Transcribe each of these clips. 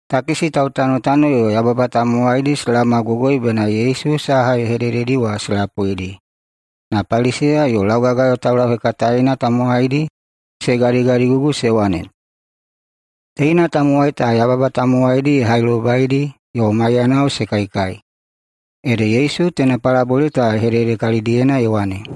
Takisi tautanotano yo baꞌaya tamowaidi se laomagogoi bena Yesu saha ye hedededi wa se lapuidi. Na Paliseya yo laugagayo taulauhekataena tamowaidi se gadigadigugu se wane, “Teina tamowai ta yababa tamowaidi ye hailobaidi yo maiyanao se kaikai.” Ede Yesu teina palabole ta ye hedede kalidiyena ye wane,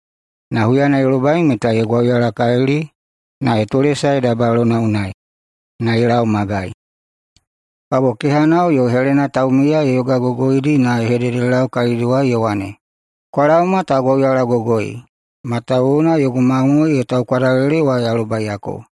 Na huyana ye lobai meta ye gwauyalakalili na ye tolesae dabayalona unai na ye lau magai. Kabo kehanao yo helena taumiya ye yogagogoidi na ye hededelau kalidiwai ye wane, ‘Kwa laoma ta gwauyalagogoi, matawuwuna yogu mamoe ye taukwadalele wa ya lobaiyako.’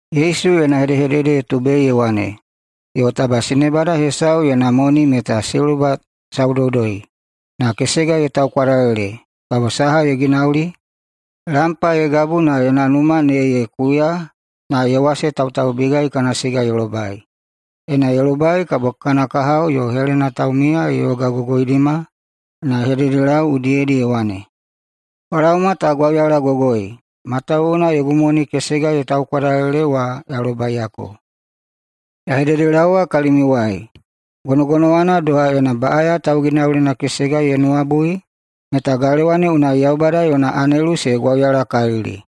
[Yesu yona hedehedede ye tubei ye wane,] “Yo taba sinebada hesau yona moni meta siluba saudoudoi, na kesega ye taukwadalele, kabo saha ye ginauli? Lampa ye gabu na yona numa ne ye kuya na ye wasetautaubigai kana siga ye lobai. Ena ye lobai kabo kana kahao yo helena taumiya ye yogagogoidima na ye hededelau udiyedi ye wane, ‘Kwa laoma ta gwauyalagogoi, matawuwuna yogu moni kesega ye taukwadalele wa ya lobaiyako.’ Ya hededelaowa kalimiuwai: Gonogonowana doha, ena baꞌaya tauginaulina kesega ye nuwabui, meta galewa ne unai Yaubada yona anelu se gwauyalakalili.”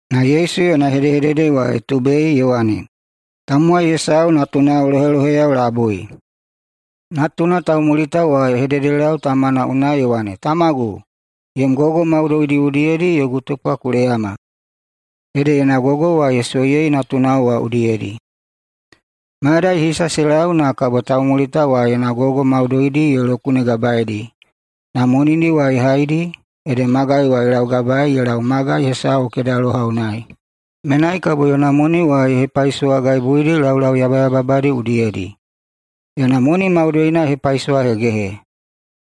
Na Yesu yona hedehedede wa ye tubei ye wane, “Tamowai hesau natunao loheloheyao labui. Natuna taumulita wa ye hededelau tamana unai ye wane, ‘Tamagu, yom gogo maudoidi udiyedi yogu tupwa ku leyama.’ Ede yona gogo wa ye soiyei natunao wa udiyedi. Mayadai hisa se lau na kabo taumulita wa yona gogo maudoidi ye lokunegabaeidi, na monidi wa ye haidi ede magai wa ye laugabaei ye lau magai hesau kedaloha unai. Menai kabo yona moni wa ye hepaisowagaibuidi laulau yabayababadi udiyedi. Yona moni maudoina ye hepaisowahegehe,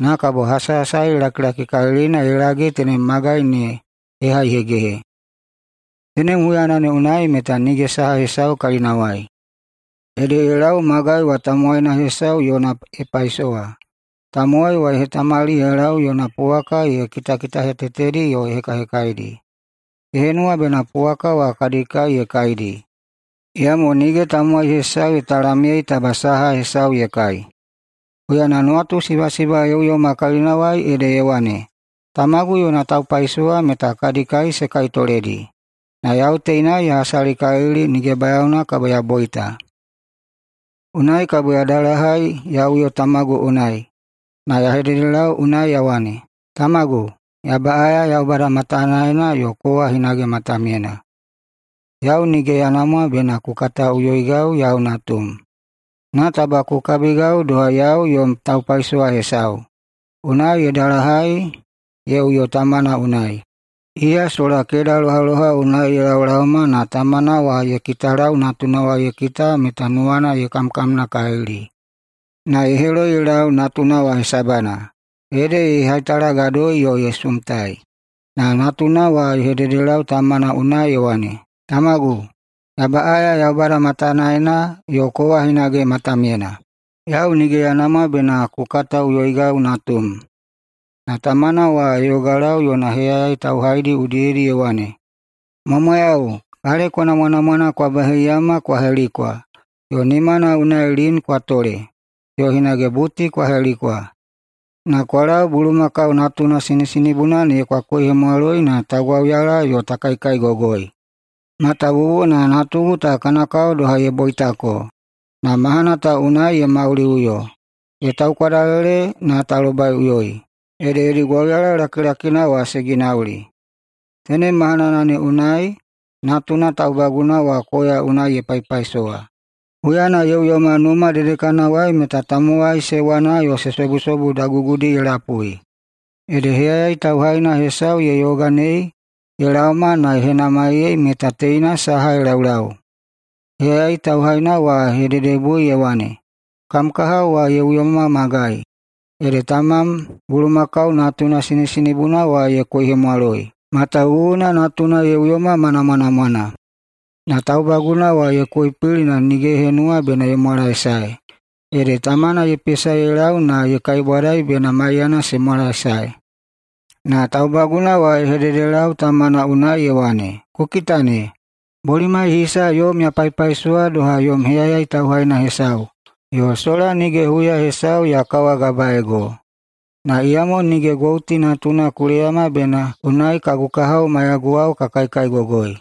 na kabo hasahasali lakilakikalilina ye lage tenem magai ne ye haihegehe. Tenem huyana ne unai meta nige saha hesau kalinawai. Ede ye lau magai wa tamowaina hesau yona ye paisowa. Tamowai wa ye hetamali ye lau yona puwaka ye kitakitahetetedi yo ye hekahekaidi. Ye henuwa bena puwaka wa kadi kai ne ye kaidi, iyamo nige tamowai hesau ye talamyei taba saha hesau ye kai. Huyana nuwatusibasiba ye uyoma kalinawai ede ye wane, ‘Tamagu yona taupaisowa meta kadi kai se kaitoledi, na yau teinai ya hasalikalili nige bayaona kabo ya boita. Unai kabo ya dalahai ya uyo tamagu unai, na ya hededelau unai ya wane, “Tamagu, ya baꞌaya Yaubada matanaena yo kowa hinage matamyena. Yau nige ya namwa bena ku kataꞌuyoigau yau natum, na taba ku kabigau doha yau yom taupaisowa hesau.” ’ Unai ye dalahai ye uyo tamana unai. Iya sola kedalohaloha unai ye laolaoma na tamana wa ye kitalau natuna ye kita meta nuwana ye kamkamnakalili. Na ye heloi ye lau natuna wa hesabana, ede ye haitalagadoi yo ye sumtai. Na natuna wa ye hededelau tamana unai ye wane, ‘Tamagu, ya baꞌaya Yaubada matanaena yo kowa hinage matamyena. Yau nige ya namwa bena ku kataꞌuyoigau natum.’ Na tamana wa ye yogalau yona heyayai tauhaidi udiyedi ye wane, ‘Mwamwayau! Kaleko namwanamwana kwa baheiyama kwa helikwa, na nimana unai lin kwa tole, yo hinage buti kwa helikwa. Na kwa lau bulumakau natuna sinisinibuna ne kwa koihemwaloi na ta gwauyala yo ta kaikaigogoi. Matawuwuna natugu ta kana kao doha ye boitako, na mahana ta unai ye mauliꞌuyo, ye taukwadalele na ta lobaiꞌuyoi.’ Ede yodi gwauyala lakilakina wa se ginauli. Tenem mahanana ne unai natuna taubaguna wa koya unai ye paipaisowa. Huyana ye uyoma numa dedekanawai meta tamowai se wana yo se sobusobu dagugudi ye lapui. Ede heyayai tauhaina hesau ye yoganei ye laoma na ye henamaiyei meta teina saha ye laulau. Heyayai tauhaina wa ye hededebui ye wane, ‘Kam kaha wa ye uyoma magai. Ede tamam bulumakau natuna sinisinibuna wa ye koihemwaloi, matawuwuna natuna ye uyoma ma namwanamwana.’ Na taubaguna wa ye koipili na nige ye henuwa ye mwalaesae. Ede tamana ye pesa ye lau na ye kaibwadai bena maiyana se mwalaesae. Na taubaguna wa ye hededelau tamana unai ye wane, ‘Ku kita ne! Bolimai hisa yom ya paipaisowa doha yom heyayai tauhaina hesau yo sola nige huya hesau ya kawagabaeigo. Na iyamo nige gouti natuna ku leyama bena unai kagu kahao maiyaguwao ka kaikaigogoi.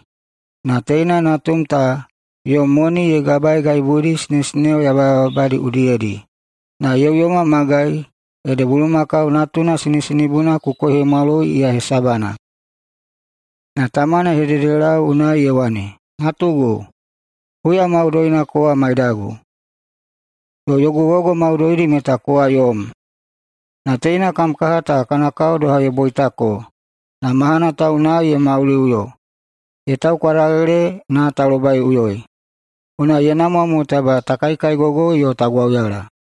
Na teina natum ta yom moni ye gabagaibuidi sinesineo yabayababadi udiyedi, na ye uyoma magai, ede bulumakau natuna sinisinibuna ku koihemwaloi iya hesabana.’ Na tamana ye hededelau unai ye wane, ‘Natugu, huya maudoina kowa maidagu, yo yogu gogo maudoidi meta kowa yom. Na teina kam kaha ta kana kao doha ye boitako na mahana ta unai ye mauliꞌuyo, ye taukwadalele na ta lobaiꞌuyoi. Unai ye namwa mo taba ta kaikaigogoi yo ta gwauyala.’”